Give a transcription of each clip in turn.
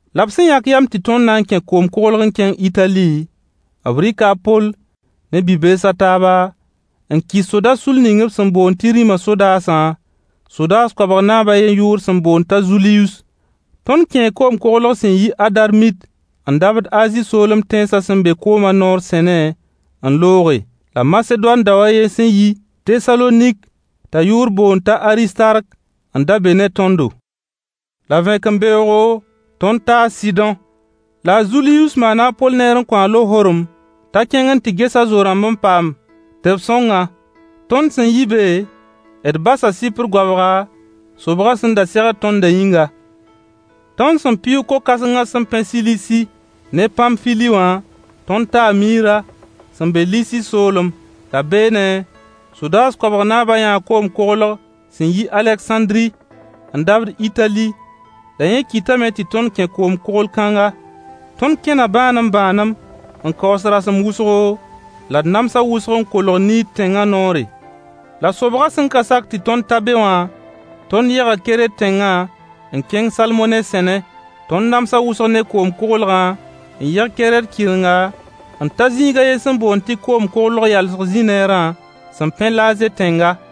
La b sẽn yãk yam tɩ tõnd na n kẽ koom-koglg n kẽng Itali, b rɩka a Poll ne bi-bees a taaba, n kɩs soda-sull ning b sẽn boond tɩ rĩma sodaasã, sodaas koabg naab a yen yʋʋr sẽn boond t'a Zulius. Tõnd kẽe koom-koglg sẽn yi Adarmit n dabd Azi soolem tẽnsã sẽn be koomã noor sẽne n looge. La Masedoan dao a ye sẽn yi Tesalonik t'a yʋʋr boond t'a Aristark n da be ne tõndo. La vẽkembeoogo, tõnd taa Sɩdõ. La a Zulius maana a Poll neer n kõ-a lohorem t'a kẽng n tɩ ges a Zo-rãmb n paam tɩ b sõng-a. Tõnd sẽn yi be, d basa Sɩpr goabga, sobgã sẽn da segd tõndã yĩnga. Tõnd sẽn pɩʋʋg ko-kãsengã sẽn pẽ Silisi ne Pamfili wã, tõnd taa Miira sẽn be Lisi soolem. La beene, sodaas koabg naabã yãa koom-koglg sẽn yi Alegsãndri n dabd Itali, la yẽ kɩtame tɩ tõnd kẽe koom-koglg-kãngã. Tõnd kẽna bãanem-bãanem n kaoos rasem wʋsgo, la d namsa wʋsg n kolg Kinid tẽnga noore. La sobgã sẽn ka sak tɩ tõnd ta be wã, tõnd yega Kɛrɛt tẽngã n kẽng Salmone sẽne. Tõnd namsa wʋsg ne koom-koglgã n yeg Kɛrɛt kɩrenga, n ta zĩiga a yen sẽn boond tɩ Koom-koglg yalsg zĩ-neerã sẽn pẽ Laaze tẽnga.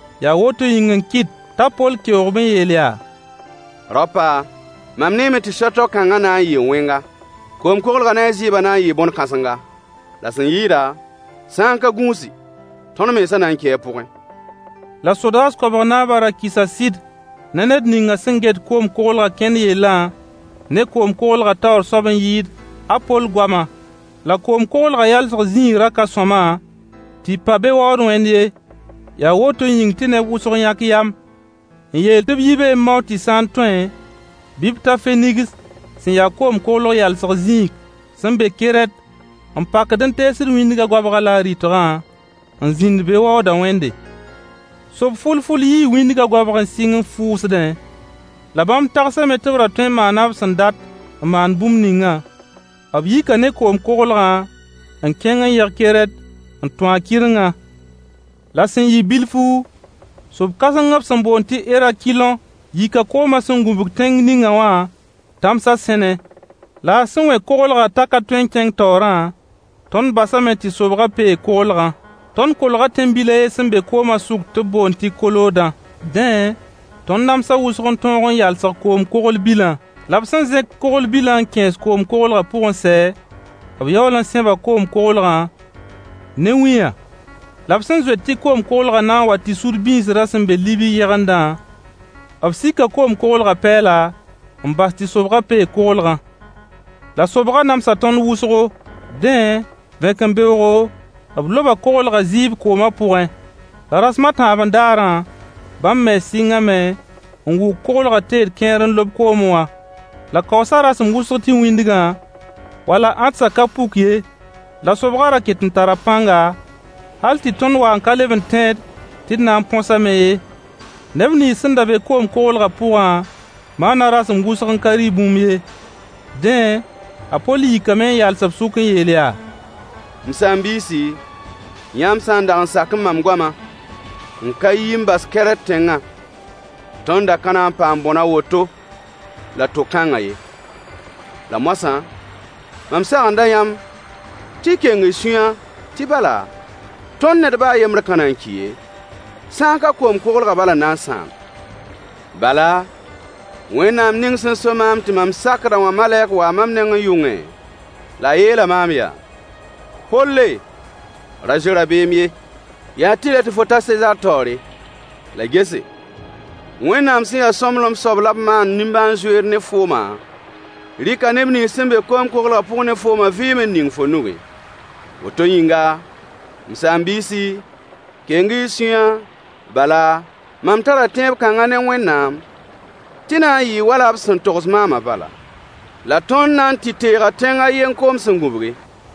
Yaa woto yĩng n kɩt t'a Poll keoog-b n yeel yaa: Raopa, mam neeme tɩ so-toak-kãngã na n yɩɩ wẽnga, koom-koglgã ne a zɩɩbã na n yɩɩ bõne-kãsenga, la sẽn yɩɩda, sã n ka gũusi tõnd mensã na n kii a pʋgẽ. La sodaas koabg naabã ra kɩsa sɩd ne ned ninga sẽn get koom-koglgã kẽnd yellã ne koom-koglgã taoor soab n yɩɩd a Poll goama. La koom-koglgã yalsg zĩig ra ka sõama tɩ pa be waood wẽnd ye, yaa woto yĩng tɩ neb wʋsg yãk yam n yeel tɩ b yi be n mao tɩ sã n tõe bɩ b ta Fenigs sẽn ya koom-koglg yalsg zĩig sẽn be Kɛrɛt n pakd n teesd wĩndgã goabga la a rɩtgã, n zĩnd be waoodã wẽnde. Sob-fʋl-fʋl yii wĩndgã goabg n sɩng n fʋʋsdẽ, la bãmb tagsame tɩ b ra tõe n maana b sẽn dat n maan bũmb ningã. B yika ne koom-koglgã n kẽng n yeg Kɛrɛt n tũ a kɩrengã. La sẽn yɩ bilfu, sob-kãseng b sẽn boond tɩ Erakilõ yika koomã sẽn gũbg tẽng ninga wã tãmsa sẽne. La a sẽn wẽ koglgã t'a ka tõe n kẽng taoorã, tõnd basame tɩ sobgã peeg-koglgã. Tõnd kolga tẽn-bil a yen sẽn be koomã sʋk tɩ b boond tɩ Kooda. Dẽ, tõnd namsa wʋsg n tõog n yalsg koom-kogl-bilã. La b sẽn zẽk-kogl-bilã n kẽes koom-koglgã pʋg n sɛ, b yaool n sẽba koom-koglgã ne wĩyã. La b sẽn zoet tɩ koom-koglgã na n wa tɩ sud bĩisrã sẽn be Libi yegendã, b sika koom-koglgã pɛɛla n bas tɩ sobgã peeg-koglgã. La sobgã namsa tõnd wʋsgo, dẽ vẽkembeoogo, b loba koglgã zɩɩb koomã pʋgẽ. La rasem a tãabẽ daarã, bãmb mens sɩngame n wʋk-koglgã teed kẽer n lob koome wã. La kaoosa rasem wʋsg tɩ wĩndgã, wala ãdsã ka puk ye, la sobgã ra ketẽ n tara pãnga hal tɩ tõnd wa n ka leb n tẽed tɩ d na n põsame ye. Neb nins sẽn da be koom-koglgã pʋgã maana rasem wʋsg n ka rɩ bũmb ye. Dẽ, a Poll yikame n yals b sʋk n yeel yaa: M saam-biisi, yãmb sã n dag sakẽ mam goama n ka yi n bas Kɛrɛt tẽngã, tõnd da ka na n paam bõn a woto la to-kãngã ye. La moasã, mam sagenda yãmb tɩ y keng y sũyã tɩ bala, tõnd ned ba a yembr ka na n ki ye, sã n ka koom-koglgã bal n na n sãam. Bala, Wẽnnaam ning sẽn so maam tɩ mam sakd-a wã malɛk waa mam nengẽ yʋngẽ, la a yeela maam yaa: “Poll, ra zoe rabeem ye, yaa tɩlɛ tɩ fo ta Sezaar taoore. La gese, Wẽnnaam sẽn ya sõmblem soab la b maand nimbãan-zoeer ne fooma rɩka neb nins sẽn be koom-koglgã pʋg ne fooma vɩɩm n ning fo nugẽ.” Woto yĩnga, m saam-biisi, keng-y y sũyã, bala, mam tara tẽeb kãnga ne Wẽnnaam, tɩ na n yɩɩ wala b sẽn togs maana bala, la tõnd na n tɩ teega tẽng a yen koom sẽn gubgi.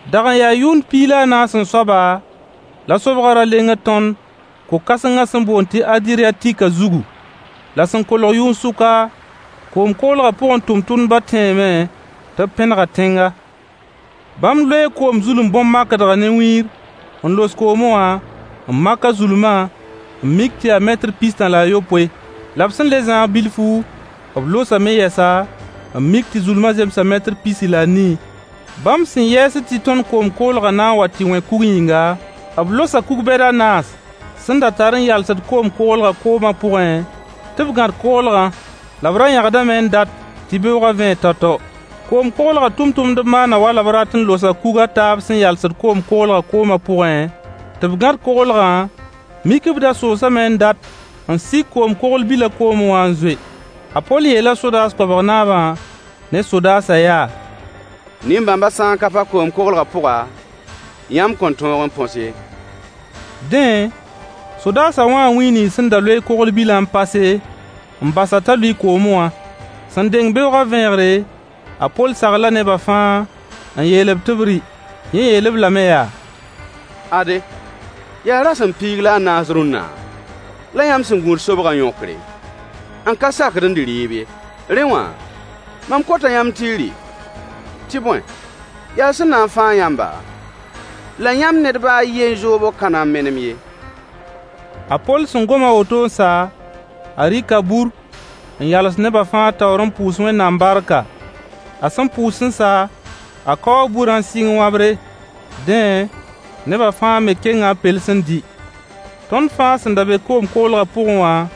Dag n yaa yʋnd piig la a naas-n-soaba la sobgã ra lengd tõnd ko-kãsengã sẽn boond tɩ Adɩryatikã zugu. La sẽn kolg yʋn-sʋka, koom-koglgã pʋgẽ tʋmtʋmdbã tẽeme tɩ b pẽnega tẽnga. Bãmb loee koom zulum bõn-makdgã ne wĩir n los koome wã n mak a zulma n mik tɩ yaa metr pis-tã la a yopoe. La b sẽn le zãag bilfu, b losame yɛsa n mik tɩ zulma zemsa metr pisi la a nii. Bãmb sẽn yɛɛsd tɩ tõnd koom-koglgã na n wa tɩ wẽ kug yĩnga, b losa kug bɛd a naas sẽn da tar n yalsed koom-koglgã koomã pʋgẽ, tɩ b gãd-koglgã. La b ra yãgdame n dat tɩ beoogã vẽeg tao-tao. Koom-koglgã tʋmtʋmdb maana wala b rat n losa kug a taab sẽn yalsed koom-koglgã koomã pʋgẽ tɩ b gãd-koglgã, mik b da soosdame n dat n sik koom-kogl bilã koome wã n zoe. A Poll yeela sodaas koabg naabã ne sodaasã yaa: Nin-bãmba sã n ka pa koom-koglgã pʋga, yãmb kõn tõog n põs ye. Dẽ, sodaasã wãa wĩ nins sẽn da loe kogl-bilã n pase, n bas-a t'a lʋɩ koomẽ wã. Sẽn deng beoogã vẽegre, a Poll sagla neba fãa n yeel-b tɩ b rɩ. Yẽ yeel-b lame yaa: Ade, yaa rasem piig la a naas rũnna la yãmb sẽn gũud sobgã yõkre, n ka sakd n dɩ rɩɩb ye. Rẽ wã, mam kota yãmb tɩ y rɩ, tɩ bõe, yaa sẽn na n fãag yãmba, la yãmb ned ba a yen zoobg ka na n menem ye. A Poll sẽn gom a woto n sa, a rɩka bur n yals neba fãa taoor n pʋʋs Wẽnnaam barka. A sẽn pʋʋs n sa, a kaoo burã n sɩng wãbre. Dẽ, neba fãa me kenga b pels n dɩ. Tõnd fãa sẽn da be koom-koglgã pʋgẽ wã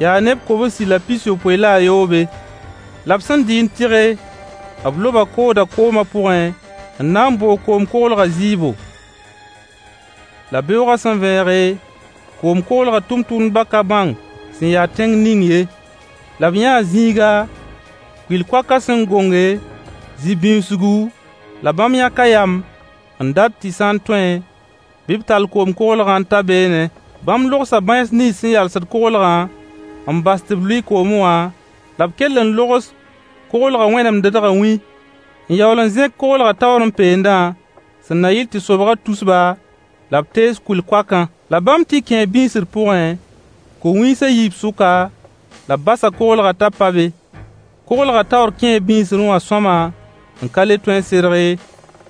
yaa neb kobsi la pis-yopoe la a yoobe. La b sẽn dɩ n tɩge, b loba koodã koomã pʋgẽ n na n boog koom-koglgã zɩɩbo. La beoogã sẽn vẽege, koom-koglgã tʋmtʋmdbã ka bãng sẽn ya tẽng ning ye. La b yãa zĩiga, kʋɩl-koakã sẽn gonge, zĩ-bĩuusgu, la bãmb yãka yam n dat tɩ sã n tõe, bɩ b tall koom-koglgã n ta beene. Bãmb logsa bãens nins sẽn yalsd-koglgã n bas tɩ b lʋɩ koomẽ wã, la b kell n logs-koglgã wẽnemdedgã wĩ, n yaool n zẽk-koglgã taoorẽ peendã, sẽn na yɩl tɩ sobgã tus-ba, la b tees kʋɩl-koakã. La bãmb tɩ kẽe bĩisr pʋgẽ, ko-wĩis a yiib sʋka, la b basa koglgã t'a pa be. Koglgã taoor kẽe bĩisrẽ wã sõama n ka le tõe n serg ye.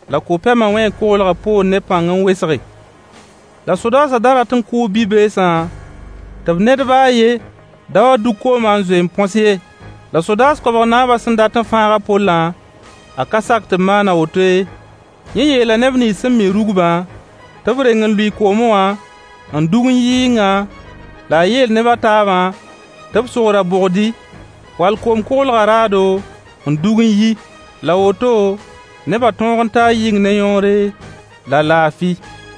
La ko-pɛmã wẽe koglgã poor ne pãng n wesge. La sodaasã da rat n kʋʋ bi-beesã tɩ b ned ba a yen da wa dug koomã n zoe y põs ye. La sodaas koabg naabã sẽn dat n fãag a Pollã, a ka sak tɩ b maan a woto ye. Yẽ yeela neb nins sẽn mi rugbã tɩ b reng n lʋɩ koome wã n rug n yi yɩnga, la a yeel neb a taabã tɩ b sog ra-bogdɩ, wall koom-koglgã raado, n dug n yi. La woto, neba tõog n taa yɩng ne yõore la laafɩ.